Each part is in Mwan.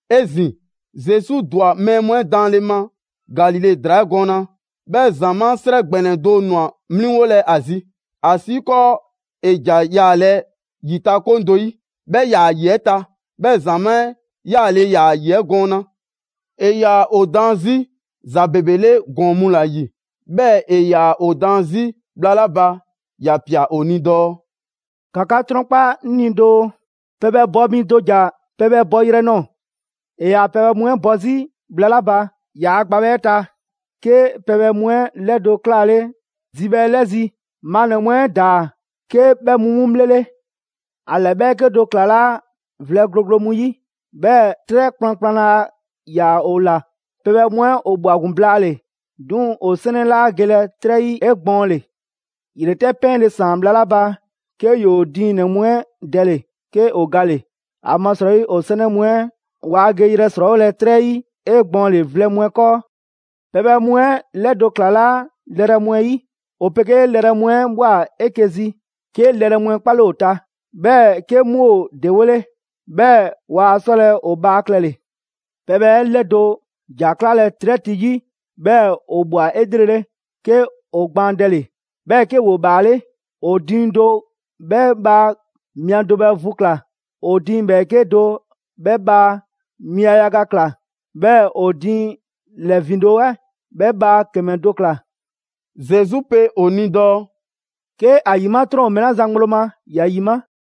'Ezin‑, Zesu ‑dwa mɛɛ mu 'ɛ daanle ma Galile ‑draa 'ɛ gɔɔna. 'Bhɛɛ‑ ‑zamaa' 'srɛ ‑gbɛnɛ do ꞊nwa 'mliŋgolɛ a zi, ‑asiikɔɔ ‑e ‑ja yaalɛ ‑yitakoŋ do 'yi, 'bhɛ ‑yaa ‑yi 'ɛ ta, 'bhɛɛ‑ ‑zamaa' 'ɛ 'yaale‑ ‑yaa ‑yi 'ɛ gɔɔna. ‑E ‑yaa ‑o daan 'zi ‑za ‑bebe 'le ‑gɔɔn mu ‑la ‑yi, 'bhɛɛ‑ ‑e ‑yaa ‑o daan 'zi bhla 'la ba ‑ya ꞊pia ‑o ni dɔɔ: «‑Ka 'ka 'trɔnkpa 'ŋ ni doo: Pɛbhɛ bɔ mi do ‑ja pɛbhɛ bɔyrɛ nɔɔ‑. ‑E ‑yaa pɛbhɛ mu 'ɛ bɔ 'zi bhla 'la ba ‑yaa' gbabhɛ 'ɛ ta, 'ke pɛbhɛ mu 'ɛ 'lɛdo‑ 'klaale zibhɛ 'ɛ 'lɛzi‑, maannɛ‑ mu 'ɛ ‑daa 'ke 'bhɛ mu 'mu 'bhlele. ‑A ‑lɛ ‑bhɛɛke' do ‑klalaa' vlɛ gloglo mu 'yi, 'bhɛɛ‑ 'trɛ kplankplan laa ‑yaa ‑o ‑la. Pɛbhɛ mu 'ɛ ‑o ꞊bhwa ‑gun blaale‑, 'duŋ‑ ‑o 'sɛnɛ 'laa gelɛ 'trɛ 'yi 'egbɔɔnle. ‑Yretɛ' 'pɛɛnle‑ ‑saan bhla 'la ba, 'ke ‑yoo diiŋ ‑nɛ mu 'ɛ dɛle‑, 'ke ‑o gale‑; ‑amasrɔyi ‑o 'sɛnɛ mu 'ɛ waa geyrɛ ‑srɔɔwolɛ 'trɛ 'yi 'egbɔɔnle vlɛ mu 'ɛ 'kɔɔ. Pɛbhɛ mu 'ɛ 'lɛdo‑ ‑klalaa' lɛrɛ mu 'ɛ yi. ‑O 'pegee lɛrɛ mu 'ɛ ꞊bhwa 'eke‑ zi, 'ke lɛrɛ 'mu 'ɛ 'kpale ‑o ta, 'bhɛɛ‑ 'ke 'mu ‑o ‑dewole. 'Bhɛɛ‑ waa 'sɔlɛ‑ ‑o bhaa klɛle‑. Pɛbhɛ 'ɛ 'lɛdo‑ ‑ja ‑klalaa' 'trɛ ti 'yi. 'Bhɛɛ‑ ‑o ꞊bhwa 'elrele, 'ke ‑o gbaandɛle, 'bhɛɛ‑ 'ke ‑woo ‑bhaale'. ‑O diiŋ do 'bhɛ bhaa mia do bhɛ vu ꞊kla, ‑o diiŋ ‑bhɛɛke' do 'bhɛ bhaa mia yaga ꞊kla, 'bhɛɛ‑ ‑o diiŋ ‑lɛ ‑vindo' 'ɛ 'bhɛ bhaa ‑kɛmɛ do ꞊kla.» Zesu 'pe ‑o ni dɔɔ: «'Ke ‑a ‑yima' 'trɔn ‑o mɛɛ 'la zan ŋgblo ma, ‑ya ‑yima'!»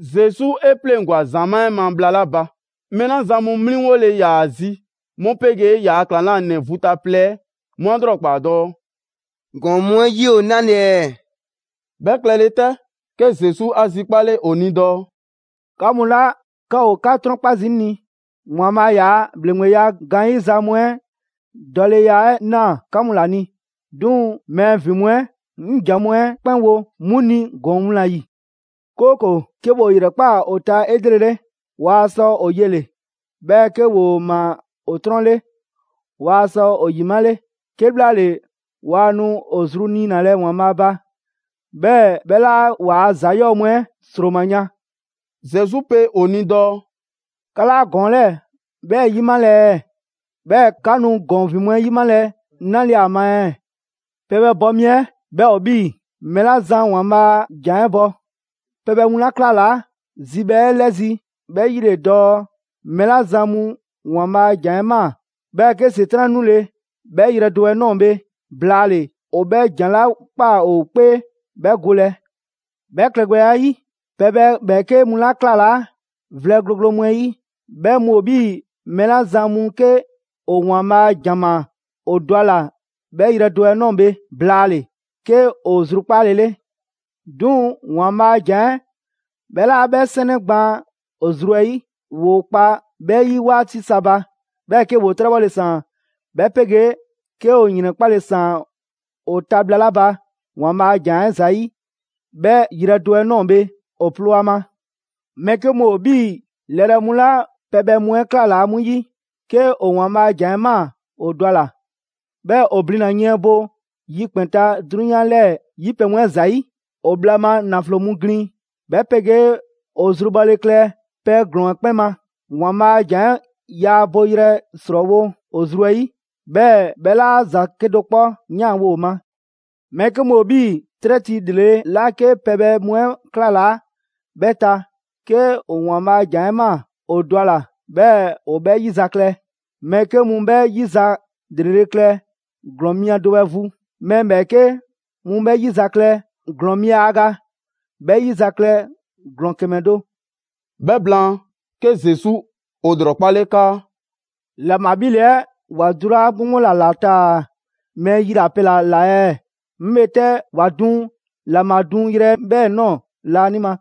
Zesu 'e 'pleŋgwa‑ ‑zamaa' 'ɛ ma bhla 'la ba, mɛɛ 'la zan mu 'mliŋgole ‑yaa ‑a zi 'mu 'pegee ‑yaa' ‑klaŋlanɛ vu ta plɛ 'ɛ 'mu 'a ‑lrɔkpaa dɔɔ: «‑Gɔɔn mu 'ɛ 'yi ‑o 'nale‑ ɛɛ?» 'Bhɛ klɛle 'tɛ, ke Zesu 'a zikpale ‑o ni dɔɔ: «'Ka mu 'la 'ka ‑o 'ka 'trɔnkpa zii' 'ŋ ni, ‑Waanbhaa' ‑yaa' ‑bhleŋgbeya gaanyiza mu 'ɛ dɔleya 'ɛ ꞊naa 'ka mu ‑la ni. 'Duŋ‑ mɛɛ ‑vin mu 'ɛ, 'ŋ ‑za mu 'ɛ kpɛn wo 'mu ni ‑gɔɔn mu ‑la ‑yi, 'kooko‑, ‹'ke ‑woo ‑yrɛkpaa ‑o ta 'elrele, waa sɔ ‑o yele‑, 'bhɛɛ‑ 'ke ‑woo ꞊maa ‑o 'trɔn 'le, waa sɔ ‑o ‑yimale; 'kebhlaale waa nu ‑o zru niinalɛ ‑Waanbhaa' ba, 'bhɛɛ‑ 'bhɛ 'laa ‑waa' ‑za 'yɔɔ‑ mu 'ɛ ‑sroma yan.›» Zesu pe ‑o ni dɔɔ: «'Ka 'laa ‑gɔɔn 'lɛɛ‑ 'bhɛ 'yimalɛ ɛɛ? 'Bhɛɛ‑ 'ka nu ‑gɔɔn ‑vin mu 'ɛ 'yimalɛ 'nale‑ ‑a ma ɛɛ?» Pɛbhɛ bɔ mi 'ɛ 'bhɛ ‑o 'bhii‑ mɛɛ 'la zan ‑Waanbhaa' a ‑jan 'ɛ bɔ. Pɛbhɛ mu 'la ‑klalaa' zibhɛ 'ɛ 'lɛzi‑ 'bhɛ 'yi ‑le dɔɔ mɛɛ 'la zan mu ‑Waanbhaa' a ‑jan 'ɛ ꞊maa, 'bhɛɛ‑ 'ke ‑Setran' 'nule 'bhɛ yrɛ do 'ɛ ꞊nɔɔ bhe blaale‑, ‑o 'bhɛ ‑jan 'la ꞊kpaa ‑o 'kpee 'bhɛ golɛ. 'Bhɛ klɛgbɛya 'ɛ 'yi, pɛbhɛ ‑bhɛɛke' mu 'la ‑klalaa' vlɛ gloglo mu 'ɛ 'yi, 'bhɛ mu ‑o 'bhii‑ mɛɛ 'la zan mu 'ke ‑o ‑Waanbhaa' a ‑jan ꞊maa, ‑o dɔ ‑a ꞊la 'bhɛ yrɛ do 'ɛ ꞊nɔɔ bhe blaale‑ 'ke ‑o zrukpaale 'le. 'Duŋ‑ ‑Waanbhaa' a ‑jan 'ɛ 'bhɛ 'laa 'bhɛ 'sɛnɛ gbaan ‑o zru 'ɛ 'yi. ‑Woo kpa 'bhɛ 'yi 'waati sa ba, 'bhɛɛ‑ 'ke ‑woo 'trɛbhɔle ‑saan, 'bhɛ 'pegee 'ke ‑o ‑yrɛnkpale ‑saan ‑o ta bhla 'la ba ‑Waanbhaa' a ‑jan 'ɛ ‑zayi', 'bhɛ yrɛ do 'ɛ ꞊nɔɔ bhe ‑o ploo a ma. Mɛɛ 'ke mu ‑o 'bhii‑ lɛrɛ mu 'la pɛbhɛ mu 'ɛ ‑klalaa' 'mu 'yi. 'Ke ‑o ‑Waanbhaa' a ‑jan 'ɛ ꞊maa ‑o dɔ ‑a ꞊la. 'Bhɛɛ‑ ‑o blina‑ yiɛn bo yikpɛn‑ ta 'drunyan 'lɛɛ‑ 'yi pɛ mu 'ɛ ‑zayi'. ‑O bhla ma ‑naflo mu ‑glin, 'bhɛ 'pegee ‑o zru bhɔle klɛ pɛ ‑glɔɔn 'ɛ 'kpɛn ma, ‑Waanbhaa' a ‑jan 'ɛ yaa boyrɛ ‑srɔɔwo' ‑o zru 'ɛ 'yi, 'bhɛɛ‑ 'bhɛ 'laa ‑za 'kedo‑ 'kpɔ 'yanwo‑ ‑o ma. Mɛɛ 'ke mu ‑o 'bhii‑ 'trɛ ti ‑lrele' 'la 'ke pɛbhɛ mu 'ɛ ‑klalaa' 'bhɛ ta. 'Ke ‑o ‑Waanbhaa' a ‑jan 'ɛ ꞊maa, ‑o dɔ a ꞊la, 'bhɛɛ‑ ‑o 'bhɛ 'yizaklɛ: Mɛɛ 'ke mu 'bhɛ 'yi za ‑lrele' klɛ ‑glɔɔn mia do 'bhɛ vu, mɛɛ ‑bhɛɛke' mu 'bhɛ 'yizaklɛ ‑glɔɔn mia yaga, 'bhɛɛ‑ mɛɛ ‑bhɛɛke' mu 'bhɛ 'yizaklɛ ‑glɔɔn ‑kɛmɛ do. 'Bhɛ blaan, 'ke Zesu ‑o ‑lrɔkpale 'kaa: «‑Laŋbha 'bhile‑ 'ɛ ‑wa dulaa' 'gboŋgbo ‑la ‑la taa‑ mɛɛ yilapɛ ‑la ꞊la ɛɛ? 'Ŋ bhe 'tɛ ‑wa duŋ ‑laŋbha duŋyrɛ 'ɛ 'bhɛɛ‑ ꞊nɔɔ laanima.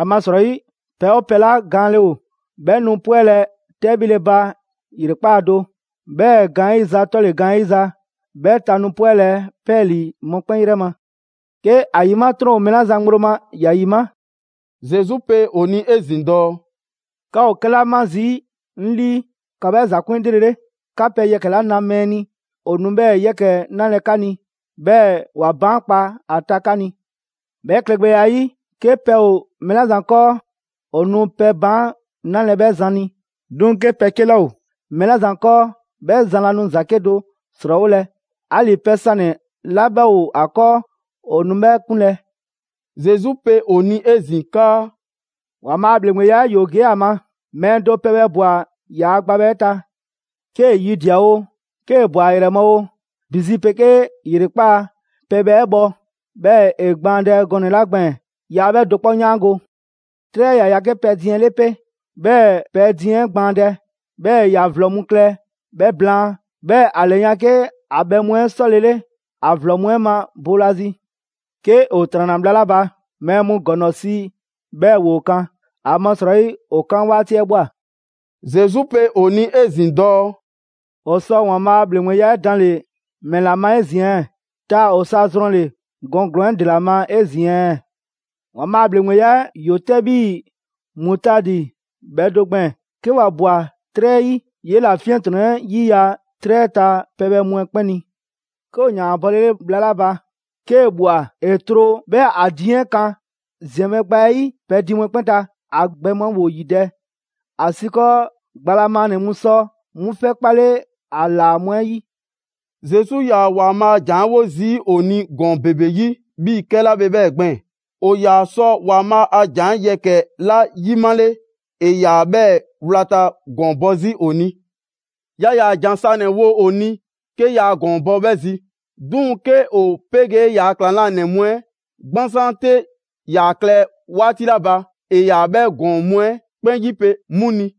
‑Amasrɔyi, pɛ 'oo pɛ 'la gaanle ‑o, 'bhɛ nu 'pwɛlɛ‑ 'tɛbhile ba ‑yrekpaa' do, 'bhɛɛ‑ gaanyiza 'tɔle‑ gaanyiza, 'bhɛ ta nu 'pwɛlɛ‑ 'pɛɛlii‑ mɔkpɛn' 'yrɛ ma. 'Ke ‑a ‑yima' 'trɔn mɛɛ 'la zan ŋgblo ma, ‑ya ‑yima'.» Zesu pe ‑o ni 'ezin‑ dɔɔ: «'Ka ‑o 'kɛla 'ma zii' 'ŋ 'lii, ‑ka 'bhɛɛ‑ ‑za 'kun 'elrele. 'Ka pɛ yɛkɛ‑ 'la na mɛɛ ni, ‑o nu 'bhɛɛ‑ yɛkɛ‑ 'nalɛ 'ka ni, 'bhɛɛ‑ ‑wa baankpa a ta 'ka ni. 'Bhɛ klɛgbɛya 'ɛ 'yi, 'ke pɛ ‑o mɛɛ 'la zan 'kɔɔ, ‑o nu pɛ baan' 'nalɛ‑ 'bhɛ zan ni. 'Duŋ‑ 'ke pɛ 'ke 'laa ‑o mɛɛ 'la zan 'kɔɔ, 'bhɛ zan laa nu ‑za 'kedo‑ ‑srɔɔwolɛ; 'ali‑ pɛ sanɛ‑ 'la 'bhɛ ‑o ‑a 'kɔɔ, ‑o nu 'bhɛ 'kunlɛ‑.» Zesu pe ‑o ni 'ezin‑ 'kaa: «‑Waanbhaa' a ‑bhleŋgbeya 'ɛ 'yoo‑ ‑gee' a ma: Mɛɛ do pɛbhɛ ꞊bwa ‑yaa' gbabhɛ 'ɛ ta. 'Kee‑ yidia‑ oo, 'kee‑ ꞊bwa ‑a ‑yrɛ ma oo, ‑bi zi 'pegee ‑yrekpaa', pɛbhɛ 'ɛ bhɔ, 'bhɛɛ‑ ‑e gbaandɛ gɔnɛ‑ 'la gbɛɛn‑ yaa 'bhɛ do 'kpɔ 'yaango‑. 'Trɛ 'ɛ ‑ya ya 'ke pɛdiiŋ 'ɛ 'le 'pe, 'bhɛɛ‑ pɛdiiŋ 'ɛ gbaandɛ, 'bhɛɛ‑ ‑ya ‑vlɔ mu klɛ 'bhɛ blaan, 'bhɛɛ‑ ‑a ‑lɛyan' 'ke ‑a bhɛ mu 'ɛ 'sɔlele ‑a ‑vlɔ mu 'ɛ ma boolazi. 'Ke ‑o ‑tranna bhla 'la ba, mɛɛ mu ‑gɔŋlɔ si 'bhɛɛ‑ ‑woo kan, ‑amasrɔyi ‑o 'kan 'waati 'ɛ ꞊bhwa.» Zesu pe ‑o ni 'ezin‑ dɔɔ: «‑O ‑sɔ ‑Waanbhaa' ‑bhleŋgbeya 'ɛ danle‑ ‑mɛla ma 'ezin‑ ɛɛ? Taa‑ ‑o sɔ ‑a zrɔnle‑ ‑gɔɔn ‑glɔɔn 'ɛ ‑dela ma 'ezin‑ ɛɛ?» ‑Waanbhaa' ‑bhleŋgbeya ‑yoo 'tɛ 'bhii‑ mutaadi bhɛ do gbɛɛn‑, 'ke ‑wa ꞊bwa 'trɛ 'ɛ 'yi, 'yela‑ 'fiɛntrɔnnɛ 'yiya‑ 'trɛ 'ɛ ta pɛbhɛ mu 'ɛ 'kpɛn ni. 'Ke ‑o ‑yaan ‑a bɔlele bhla 'la ba, 'kee‑ ꞊bhwa ‑e tro 'bhɛɛ‑ ‑a diiŋ 'ɛ kan ‑ziɛnbhɛ' gba 'ɛ 'yi pɛdiiŋ mu 'ɛ 'kpɛn ta, ‑a gbɛ mu 'ɛ ‑woo ‑yidɛ', ‑asiikɔɔ gba la maannɛ‑ mu sɔ 'mu 'fɛ 'kpalɛ‑ ‑a ‑laa mu 'ɛ 'yi. Zesu 'yaa‑ ‑Waanbhaa' a jan 'ɛ 'wo zii' ‑o ni ‑gɔɔn ‑bebe 'yi 'bhii‑ 'kɛla bhe 'bhɛ gbɛɛn‑. ‑O ‑yaa sɔ ‑Waanbhaa' a ‑jan yɛkɛ‑ 'la 'yimale, ‑e ‑yaa 'bhɛɛ‑ wlata ‑gɔɔn bɔ 'zi ‑o ni. Yaa ‑yaa ‑jan sanɛ‑ ‑wo ‑o ni, 'ke yaa ‑gɔɔn bɔ 'bhɛ zi. 'Duŋ‑ 'ke ‑o 'pegee ‑yaa' ‑klaŋlanɛ mu 'ɛ 'gbansaan 'te ‑yaa klɛ 'waati 'la ba, ‑e ‑yaa 'bhɛ ‑gɔɔn mu 'ɛ 'kpɛn ‑yipe' 'mu ni.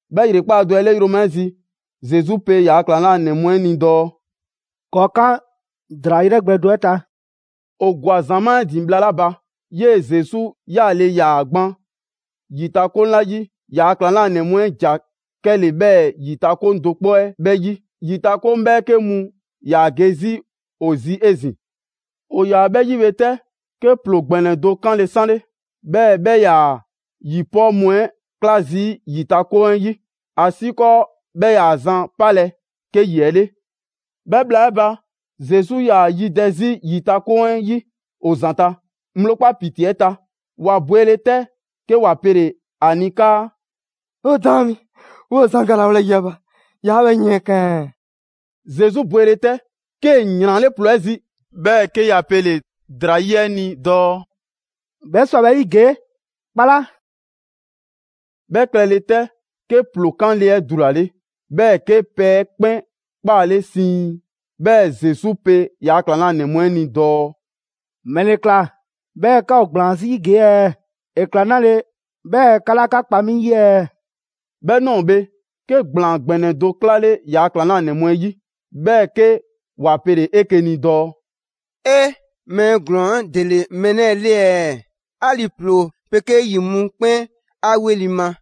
'Bhɛ ‑yrekpaa' do 'ɛ 'le yroma 'ɛ zi, Zesu pe ‑yaa' ‑klaŋlanɛ mu 'ɛ ni dɔɔ: «‑Kɔɔ' 'kan ‑draa 'yrɛ gbɛ do 'ɛ ta.» ‑O ꞊gwa ‑zamaa' 'ɛ ‑din bhla 'la ba, 'yee‑ Zesu 'yaale‑ ‑yaa gban ‑yitakoŋ 'la yi, ‑yaa' ‑klaŋlanɛ mu 'ɛ ‑ja 'kɛle‑ 'bhɛɛ‑ ‑yitakoŋ do 'kpɔ 'ɛ 'bhɛɛ‑ 'yi. ‑Yitakoŋ 'bhɛɛke mu ‑yaa ge 'zi ‑o zi 'ezin‑. ‑O ‑yaa 'bhɛ 'yi bhe 'tɛ, 'ke ‑ploo ‑gbɛnɛ do 'kanle‑ 'sanle, 'bhɛɛ‑ 'bhɛ 'yaa‑ ‑yipɔɔ' mu 'ɛ 'kla zii' ‑yitakoŋ 'ɛ 'yi, ‑asiikɔɔ 'bhɛ 'yaa‑ zan 'palɛ‑ 'ke ‑yi 'ɛ' le. 'Bhɛ bhla 'ɛ ba, Zesu 'yaa‑ yidɛ 'zi ‑yitakoŋ 'ɛ 'yi ‑o ‑zanta', ŋgblo 'kpa ‑piti 'ɛ ta. ‑Wa bwele 'tɛ, 'ke ‑wa pele‑ ‑a ni 'kaa: «'O daan mi, 'woo‑ zan galawolɛ ‑yi 'ɛ ba, 'yaa 'bhɛ yiɛnkan ɛɛ?» Zesu bwele 'tɛ, 'kee‑ ‑yranle' ‑ploo 'ɛ zi, 'bhɛɛ‑ 'ke ‑ya pele‑ ‑draa 'yi 'ɛ ni dɔɔ: «'Bhɛ 'swa‑ 'bhɛ 'yi ‑gee', 'kpala!» 'Bhɛ klɛle 'tɛ, 'ke ‑ploo 'kanle‑ 'ɛ dulale, 'bhɛɛ‑ 'ke pɛ 'ɛ 'kpɛn 'kpaale siiŋ. 'Bhɛɛ‑ Zesu pe ‑yaa' ‑klaŋlanɛ mu 'ɛ ni dɔɔ: «‑Mɛle ꞊kla 'bhɛɛ‑ 'ka ‑o ‑gblaan 'zi ‑gee' ɛɛ? ‑E ꞊kla 'nale‑ 'bhɛɛ‑ 'ka 'laa 'ka kpa 'mi 'yi ɛɛ?» 'Bhɛ ꞊nɔɔ bhe, 'ke ‑gblaan ‑gbɛnɛ do 'klale ‑yaa' ‑klaŋlanɛ mu 'ɛ 'yi, 'bhɛɛ‑ 'ke ‑wa pele‑ 'eke‑ ni dɔɔ: «'E! Mɛɛ ‑glɔɔn 'ɛ ‑dele mɛɛ 'lɛɛ‑ 'le ɛɛ? 'Ali‑ ‑ploo 'pegee 'yi 'mu 'kpɛn 'a 'weli‑ ma.»